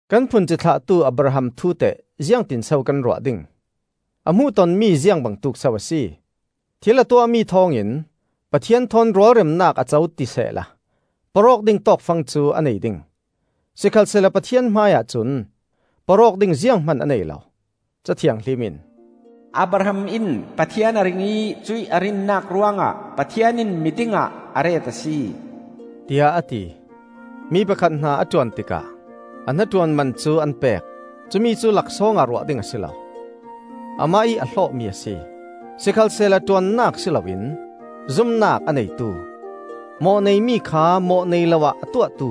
Kan phun cithlahtu Abraham thu teh ziangti in so kan ruah ding? A hmuhton mi ziang bangtuk so a si? Thil a tuahmi thawngin Pathian thawn rualremnak a co ti sehla porh awk ding tawkfang cu a nei ding! Sikhalsehla Pathian hmaiah cun porh awk ding zianghman a nei lo. Ca Thianghlim in, “Abraham in Pathian a ring ih cuih a rinnak ruangah Pathian in miding ah a ret a si,” tiah a ti. Mi pakhat hna a ṭuan tikah a hnaṭuan man cu an pek; cumi cu laksawngah ruah ding a si lo. Amah ih a hlawhmi a si. Sikhalsehla ṭuannak si loin zumnak a neitu, mawh-nei mi kha mawh-nei lo ah a tuahtu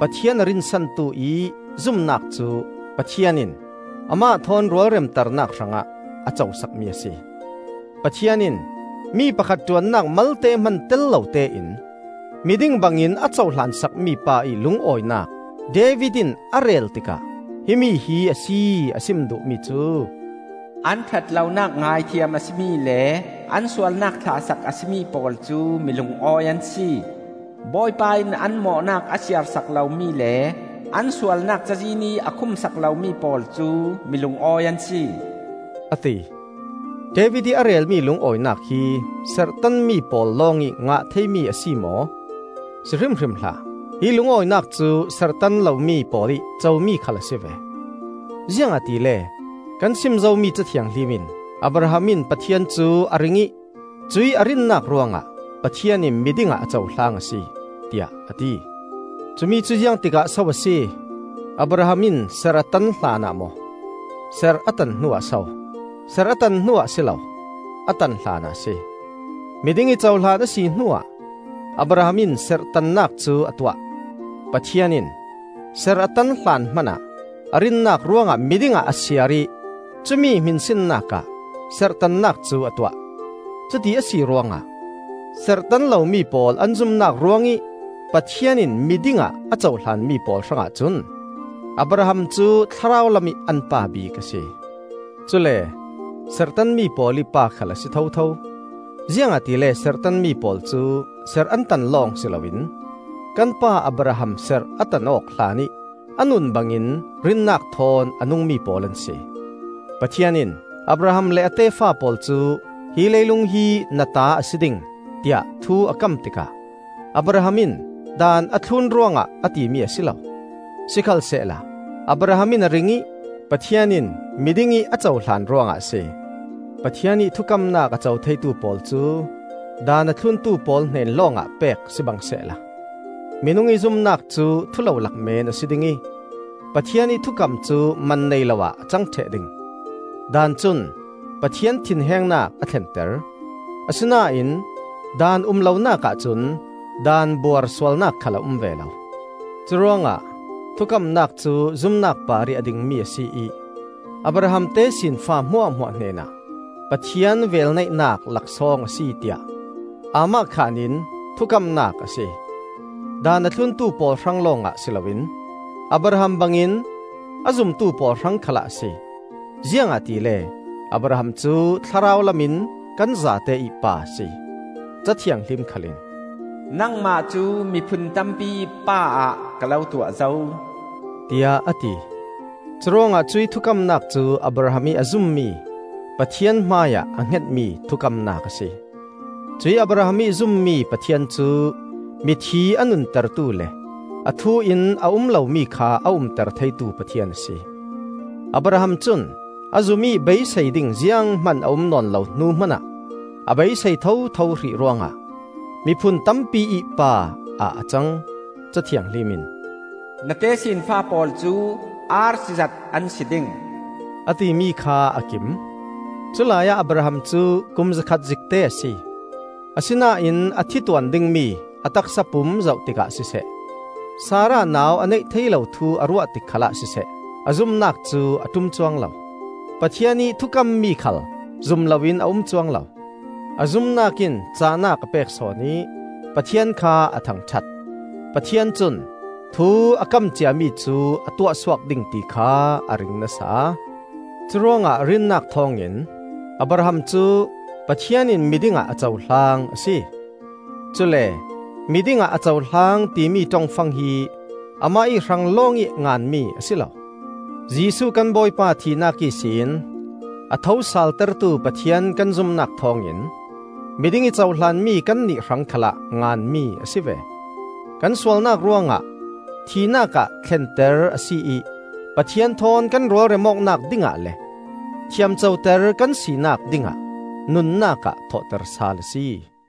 Pathian a rinsantu ih zumnak cu Pathian in amah thawn rualremternak hrangah a co sakmi a si. Pathian in mi pakhat ṭuannak malte hman tel lotein miding bangin a cohlan sakmi pa ih lungawinak David in a rel tikah himi hi a si a sim duh mi cu: “An ṭhatlonak ngaithiam a si mi le an sualnak thlahsak a si mi pawl cu milungawi an si. Bawipa in an mawhnak a siarsak lomi le an sualnak cazin ih a khumsak lomi pawl cu milungawi an si,” a ti. David ih a relmi lungawinak hi serhtanmi pawl lawngih ngah theimi a si maw? Si hrimhrim hlah! Hi lungawinak cu serhtan lomi pawl ih comi khal a si ve. Ziangahtile kan sim zomi Ca Thianghlim in, “Abraham in Pathian cu a ring ih cuih a rinnak ruangah Pathian in miding ah a cohlang a si,” tiah a ti. Cumi cu ziangtikah so a si? Abraham in serh a tan hlanah maw, serh a tan hnuah so? Serh a tan hnuah a si lo, a tan hlanah a si. Miding ih cohlan a si hnuah Abraham in serhtannak cu a tuah. Pathian in serh a tan hlan hmanah a rinnak ruangah miding ah a siar ih cumi hminsinnakah serhtannak cu a tuah. Cuti a si ruangah serhtan lomi pawl an zumnak ruangih Pathian in mi dingah a cohlan mi pawl hrangah cun Abraham cu thlarau lamih an pa bik a si. Cule serhtanmi pawl ih pa khal a si thotho; ziangahtile serhtanmi pawl cu serh an tan lawng si loin, kan pa Abraham serh a tan awk hlanih a nun bangin rinnak thawn a nungmi pawl an si. Pathian in Abraham le a tefa pawl cu, hi leilung hi na ta a si ding, tiah thu a kam tikah Abraham in Daan a thlun ruangah a timi a si lo, sikhalsehla Abraham in a ring ih Pathian in miding ih a cohlan ruangah a si. Pathian ih thukamnak a co theitu pawl cu Daan a thluntu pawl hnen lawngah pek sibang sehla minung ih zumnak cu thulolak meen a si ding ih Pathian ih thukam cu man nei lo ah a cang ṭheh ding. Daan cun Pathian thinhengnak a thlenter; asinain Daan um lonak ahcun daan buar sualnak khal a um ve lo. Curuangah thukamnak cu zumnak parih a dingmi a si ih Abraham tesinfa hmuahhmuah hnenah Pathian velneihnak laksawng a si tiah aamahkhan in thukamnak a si. Daan a thluntu pawl hrang lawngah si loin Abraham bangin a zumtu pawl hrang khalah a si. Ziangahtile Abraham cu thlarau lam in kan zate ih pa a si. Ca Thianghlim khal in, “Nangmah cu miphun tampiih pa ah ka lo tuah zo,” tiah a ti. Curuangah cuih thukamnak cu Abraham ih a zummi Pathian hmaiah a hngetmi thukamnak a si. Cuih Abraham ih zummi Pathian cu mithi a nuntertu le a thu in a um lomi kha a umter theitu Pathian a si. Abraham cun a zum ih beisei ding zianghman a um nawn lo hnu hmanah a beisei thotho hrih ruangah, “Miphun tampiih pa,” ah a cang. Ca Thianghlim in, “Na tesinfa pawl cu arsi zat an si ding,” a timi kha a kim. Culai ah Abraham cu kum zakhat zikte a si; asinain a thi tuan dingmi a taksa pum zoh tikah siseh, Sarah nau a neih thei lo thu a ruah tik khalah siseh, a zumnak cu a ṭum cuang lo. Pathian ih thukammi khal zum loin a um cuang lo; a zumnak in cahnak a pek sawn ih Pathian kha a thangṭhat. Pathian cun thu a kam ciami cu a tuahsuak ding ti kha a ring nasa. Curuangah rinnak thawngin Abraham cu, “Pathian in miding ah a cohlang,” a si. Cule, “miding ah a cohlang,” timi ṭongfang hi amah ih hrang lawngih nganmi a si lo. Jesuh kan Bawipa thihnak ihsin a thosaltertu Pathian kan zumnak thawngin miding ih cohlanmi kannih hrang khalah nganmi a si ve. Kan sualnak ruangah thihnak ah thlenter a si ih Pathian thawn kan rualrem awknak dingah le thiam coter ka sinak dingah nunnak ah thawhter sal a si.